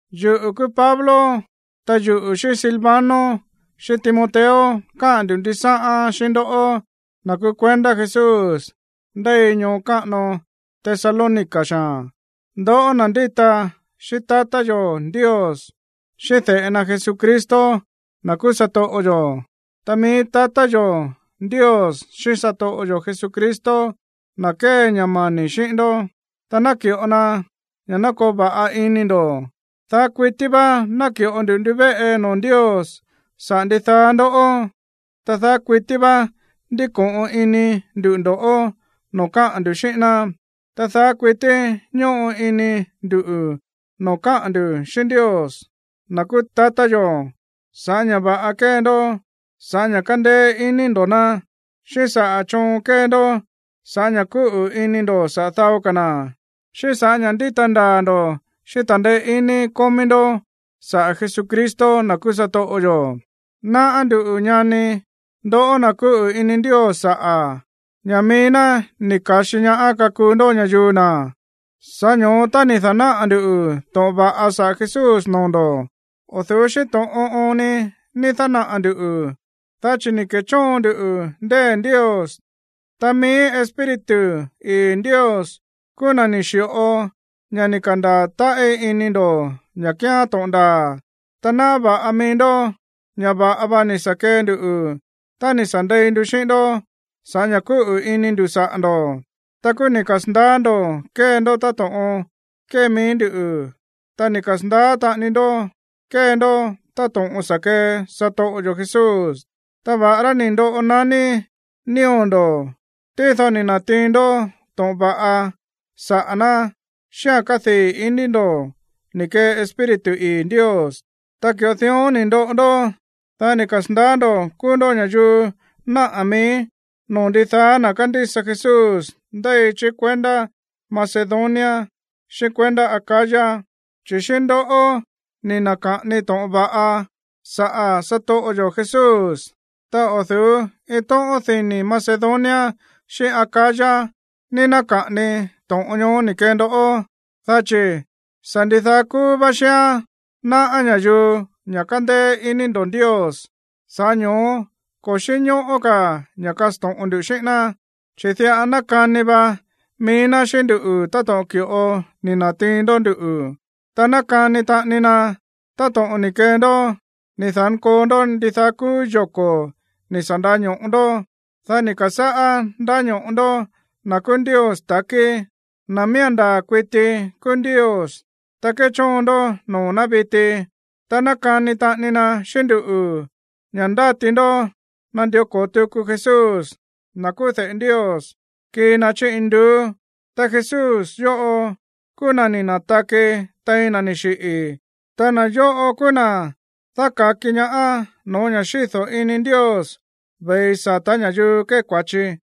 Yuꞌu̱ kúú Pablo, ta yuꞌu̱ xíꞌín Silvano xíꞌín Timoteo káꞌa̱n ndu̱ ndisáꞌán xíꞌín ndoꞌó, na̱ kúú kuendá Jesús ndéi ñoo káꞌano Tesalónica xaa̱n, ndoꞌó na̱ ndíta xíꞌín tatá yo̱ Ndios, xíꞌín de̱ꞌe na Jesucristo, na̱ kúú satoꞌo yo̱. Ta mií tatá yo̱ Ndios xíꞌín satoꞌo yo̱ Jesucristo ná kee ña̱ mani̱ xíꞌín ndó, ta naki̱ꞌo ná ña̱ koo va̱ꞌa ini ndo̱. Daá kuití vá náki̱ꞌo nduꞌu̱ ndivéꞌe noo̱ Ndios saꞌa̱ ndidaá ndoꞌó, ta daá kuití vá ndíko̱ꞌon ini ndu̱ ndo̱ꞌó no̱ó káꞌa̱n ndu̱ xíꞌín ná, ta daá kuití ñóꞌo ini ndu̱ noo̱ káꞌa̱n ndu̱ xíꞌín Ndios, na̱ kúú tatá yo̱, sa̱ꞌá ña̱ va̱ꞌa kée ndó sa̱ꞌá ña̱ kándéé iní ndo̱ ná, xíꞌín saꞌa̱ choon kée ndó sa̱ꞌá ña̱ kúꞌu̱ ini ndo̱ saꞌa̱ dao ka̱ na̱, xíꞌín sa̱ꞌá ña̱ ndíta ndaa̱ ndo̱ xíꞌín ta̱ndeé iní kómí ndó saꞌa̱ Jesucristo, na̱ kúú satoꞌo yo̱. Náꞌá nduꞌu̱, ñani, ndoꞌó na̱ kúꞌu̱ ini Ndios saꞌa̱, ña̱ mií ná ni̱ ka̱xi ñaá kakuu ndó ña̱yuu na̱. Sa̱ꞌá ño̱ó tá ni̱ da̱náꞌa̱ ndu̱ to̱ꞌon va̱ꞌa saꞌa̱ Jesús noo̱ ndo̱, o̱ du̱ú xíꞌín to̱ꞌon oon ni ni̱ da̱náꞌa̱ ndu̱, dá chi̱ ni̱ ke̱chóon ndu ndée̱ Ndios, ta mií Espíritu ii̱ Ndios kúú na̱ ni̱ xi̱ꞌo ña̱ ni̱ ka̱ndaa̱ táꞌí ini ndo̱ ña̱ kíán to̱ꞌon ndaa̱. Ta náꞌá va̱ꞌa mií ndó ña̱ va̱ꞌa va ni̱ sa̱ kee nduꞌu̱ tá ni̱ sa̱ ndei ndu xíꞌín ndó sa̱ꞌá ña̱ kúꞌu̱ iní ndu̱ saꞌa̱ ndo̱. Ta kúú ni̱ kasa̱ndaá ndo̱ kée ndó táto̱ꞌon kée mií ndú, ta ni̱ kasa̱ndaá taꞌani ndó kée ndó táto̱ꞌon sa̱ kee satoꞌo yo̱ Jesús. Ta va̱ꞌará ni̱ ndoꞌo naní nío̱ ndo̱, tído ni̱ na̱tiin ndó to̱ꞌon va̱ꞌa saꞌa̱ ná xíꞌa̱n kádii̱ iní ndo̱ ni̱ kee Espíritu ii̱ Ndios. Ta ki̱ꞌo dión ni̱ ndoꞌo ndó, dá ni̱ kasa̱ndaá ndo̱ kúú ndó ña̱yuu náꞌa̱ mií noo̱ ndidaá na̱ kándísa Jesús ndéi chí kuendá Macedonia xíꞌín kuendá Acaya. Chi̱ xíꞌín ndoꞌó ni̱ na̱ka̱ꞌani to̱ꞌon va̱ꞌa saꞌa̱ satoꞌo yo̱ Jesús. Ta o̱ du̱ú iin tóꞌón ní Macedonia xíꞌín Acaya ní náka̱ꞌani to̱ꞌon ñoó ni̱ kee ndoꞌó, dá chi̱ sa̱ ndidaá kúú vá xíán náꞌá ña̱yuu ña̱ kándéé iní ndo̱ Ndios. Sa̱ꞌá ño̱ó ko̱ xínñóꞌó ka̱ ña̱ kasto̱ꞌon ndu xíꞌín ná. Chi̱ diꞌa nákani va mií ná xíꞌín nduꞌu̱ táto̱ꞌon ki̱ꞌo ni̱ na̱tiin ndó nduꞌu̱, ta nákani taꞌani na táto̱ꞌon ni̱ kee ndó ni̱ da̱nkoo ndó ndidaá kúú yoko̱ ni̱ sa̱ nda̱ño̱ꞌo ndó, dá ni̱ ka̱sáꞌá ndáño̱ꞌo ndó na̱ kúú Ndios takí, na̱ miía̱n ndaa̱ kuití kúú Ndios, ta kéchóon ndó noo̱ ná viti. Ta nákani taꞌani na xíꞌín nduꞌu̱ ña̱ ndáti ndó nandió ko̱o tuku Jesús, na̱ kúú de̱ꞌe Ndios, kii na chí induú, ta Jesús yóꞌo kúú na̱ ni̱ na̱taki tein na̱ ni̱ xiꞌi̱, ta na̱ yóꞌo kúú na̱ dáka̱ki ñaá no̱ó ña̱ xído̱ ini Ndios ve̱i sata̱ ña̱yuu kée kua̱chi.